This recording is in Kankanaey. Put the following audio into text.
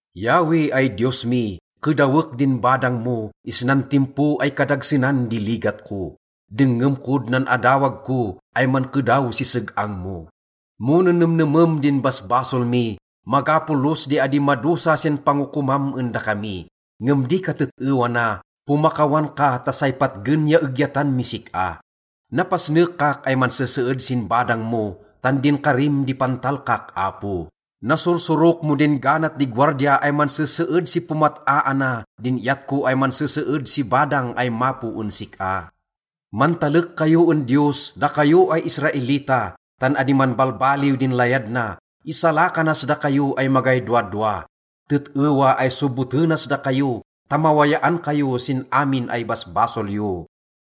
Yahweh ay Diyos mi, kedawek din badang mo isnan timpo ay kadagsenan di ligat ko. Dengngem kod nan adawag ko ay mankedaw si seg-ang mo. Mo nenemnemem din basbasol mi, maga polos di adi madosa sin pangokomam en dakami. Ngem di katet-ewa na, pomakawan ka ta say patgen ya egyatan mis sik-a. Napasnekak ay manseseed sin badang mo, tan din karim di pantalkak, Apo. Nasursurok mo din ganat di gowardia ay manseseed si pomat-aana din iyat ko ay manseseed si badang ay mapo en sik-a. Mantalek kayo en Diyos, dakayo ay Israelita, tan adi manbalbaliw din layad na, isalakanas dakayo ay magay dowadowa. Tet-ewa ay sobotenas dakayo ta mawayaan kayo sin amin ay basbasol yo.